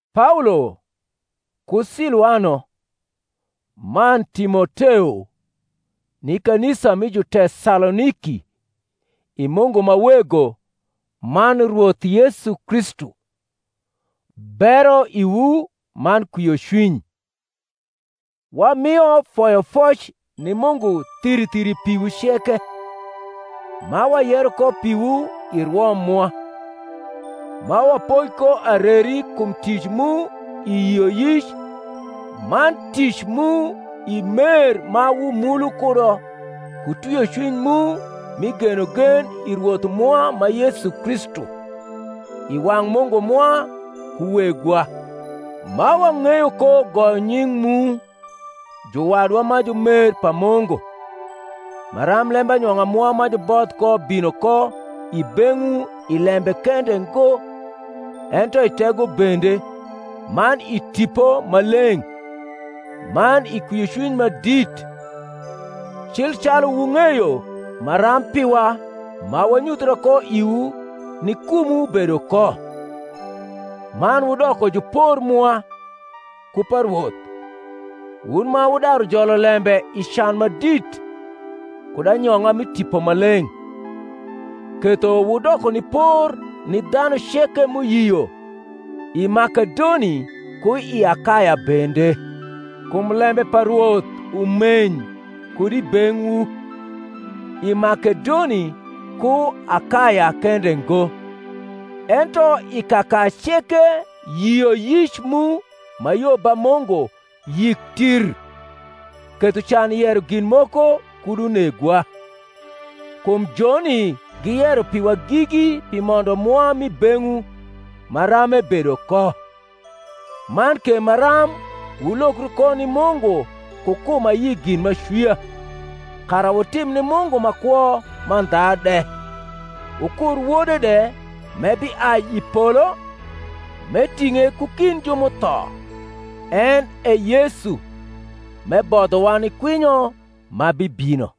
Paolo, ku Siluano, man Timoteo, ni kanisa mi Jutesaloniki i Mungu ma Wego man Rwoth Yesu Kristu: Bero iwu man kwiocwiny. Wamio foyofoc ni Mungu thiri thiri piwu ceke, ma wayero ko piwu i rwo mwa; ma wapoi ko areri kum tic mu i yioyic man tic mu i mer ma wumulu kudo ku twiocwiny mu mi genogen i Rwoth mwa ma Yesu Kristu, i wang’ Mungu mwa ku Wegwa; ma wang’eyo ko goyo nying’ mu, juwadwa ma jumer pa Mungu, maram lembanyong’a mwa ma juboth ko bino ko i beng’wu i lembe kende ngo, ento i tego bende, man i Tipo Maleng’, man i kwiocwiny ma dit; cil calu wung’eyo maram piwa ma wanyuthia ko iwu ni kumwu bedo ko. Man wudoko jupor mwa, ku pa Rwoth, wun ma wudaru jolo lembe i can ma dit, kud anyong’a mi Tipo Maleng’; ketho wudoko ni por ni dhanu ceke m’uyio i Makedoni ku i Akaya bende. Kum lembe pa Rwoth umeny kud i beng’wu, i Makedoni ku Akaya kende ngo, ento i kaka ceke yioyic mu ma yo ba Mungu yik tirr; ketho can yero gin moko kud unegwa. Kum joni giyero piwa gigi pi mondo mwa m’i beng’wu maram ebedo ko; man ke maram wulokru ko ni Mungu ku kum ayi gin m’acwia, kara wutim ni Mungu ma kwo mandha de, wukur Wode de m’ebiai i polo, m’eting’e ku kind ju m’utho, en e Yesu, m’ebodhowa ni kwinyo ma bibino.